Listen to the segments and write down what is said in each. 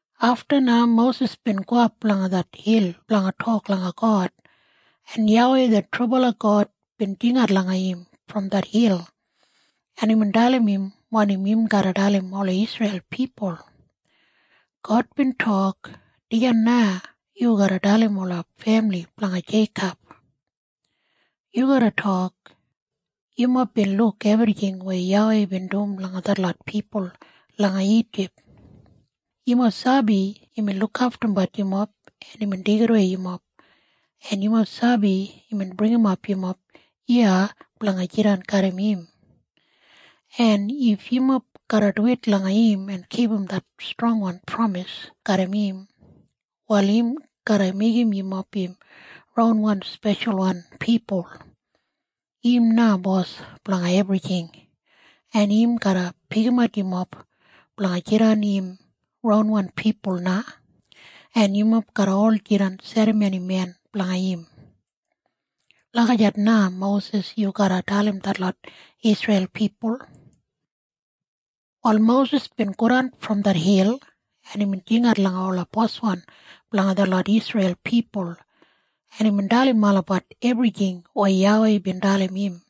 Afta na Mosis bin gowap langa det hil blanga tok langa God, en YAWEI det trubala God bin jingat langa im brom det hil, en imbin dalim im wanim im garra dalim ola Isreil pipul. God bin tok, “Dijan na yu garra dalim ola femili blanga Jeikob. Yu garra tok, ‘Yumob bin luk ebrijing weya YAWEI bin dum langa detlot pipul langa Ijip. Yumob sabi imbin lukaftumbat yumob en imbin deigidawei yumob, en yumob sabi imbin bringimap yumob iya blanga jidan garram im. En if yumob garra duwit langa im en kipum det strongwan pramis garram im, wal im garra meigim yumob im ronwan speshalwan pipul. Im na bos blanga ebrijing, en im garra pikimat yumob blanga jidan im ronwan pipul na, en yumob garra ol jidan serramonimen blanga im.’ Lagijat na, Mosis, yu garra dalim detlot Isreil pipul.” Wal Mosis bin godan brom det hil, en imbin jingat langa ola boswan blanga detlot Isreil pipul, en imbin dalim olabat ebrijing weya YAWEI bin dalim im,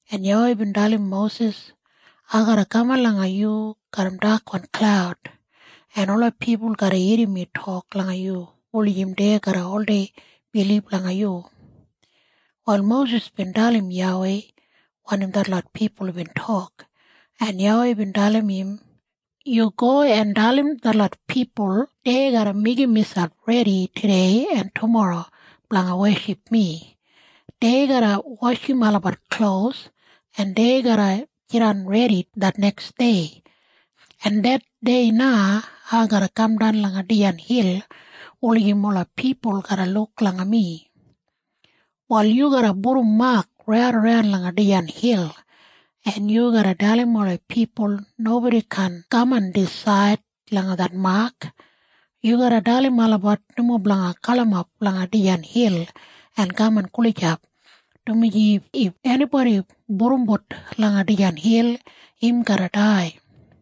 en YAWEI bin dalim Mosis, “Ai garra kaman langa yu garram dakwan klaud, en ola pipul garra irrim mi tok langa yu wulijim dei garra oldei bilib langa yu.” Wal Mosis bin dalim YAWEI wanim detlot pipul bin tok, en YAWEI bin dalim im, “Yu go en dalim detlot pipul dei garra meigim miselp redi tudei en tumorro blanga weship mi. Dei garra washim olabat klos, en dei garra jidan redi det neksdei, en det dei na ai garra kamdan langa dijan hil wulijim ola pipul garra luk langa mi. Wal yu garra pudum mak raidaran langa dijan hil, en yu garra dalim ola pipul nobodi kaan kaman disaid langa det mak. Yu garra dalim olabat nomo blanga galimap langa dijan hil en kaman gulijap, dumaji if enibodi pudumbut langa dijan hil, im garra dai.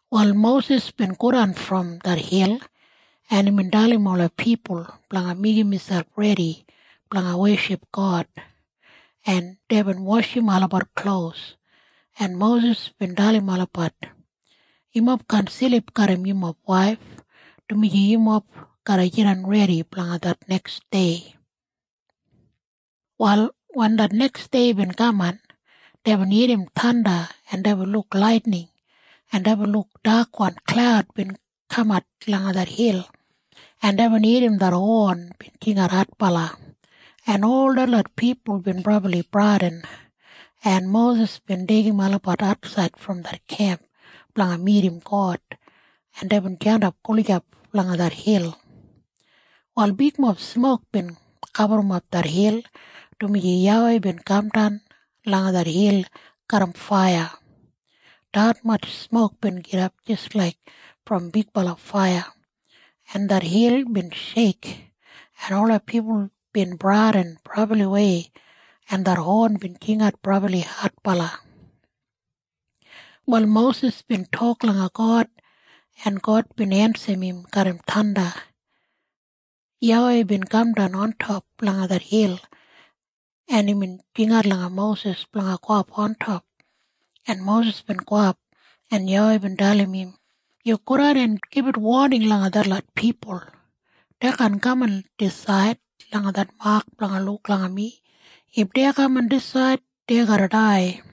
Wal Mosis bin godan brom det hil, en imbin dalim ola pipul blanga meigim miselp redi blanga weship God, en deibin washim olabat klos, en Mosis bin dalim olabat, “Yumob kaan silip garram yumob waif, dumaji yumob garra jidan redi blanga det neksdei.” Wal wen det neksdei bin kaman, deibin irrim thanda, en deibin luk laitining, en deibin luk dakwan klaud bin kamat langa det hil, en deibin irrim det hon bin jingat adbala, en ol detlot pipul bin brabli bradin, en Mosis bin deigim olabat atsaid brom det kemp blanga midim God, en deibin jandap gulijap langa det hil. Wal bigmob smok bin gaburrumap det hil, dumaji YAWEI bin kamdan langa det hil garram faiya. Detmatj smok bin gidap jis laik brom bigbala faiya, en det hil bin sheik, en ola pipul bin bradin brabliwei, en det hon bin jingat brabli adbala. Wal Mosis bin tok langa God, en God bin ensim im garram thanda. YAWEI bin kamdan ontop langa det hil, en imbin jingat langa Mosis blanga gowap ontop, en Mosis bin gowap, en YAWEI bin dalim im, “Yu godan en gibit woning langa detlot pipul. Dei kaan kaman disaid langa det mak blanga luk langa mi. If dei kaman disaid, dei garra dai.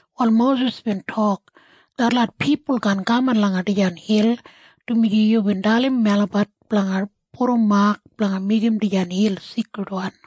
Wal Mosis bin tok, “Detlot pipul kaan kaman langa dijan hil, dumaji yubin dalim melabat blanga pudum mak blanga meigim dijan hil seikridwan.”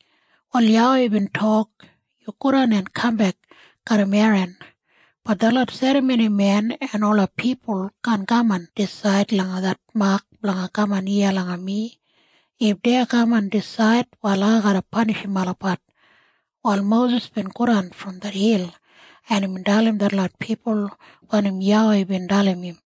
Wal YAWEI bin tok, “Yu godan en kambek garram Eran. Bat detlot serramonimen en ola pipul kaan kaman disaid langa det mak blanga kaman iya langa mi. If dei kaman disaid, wal ai garra panishim olabat.” Wal Mosis bin godan brom det hil, en imbin dalim detlot pipul wanim YAWEI bin dalim im.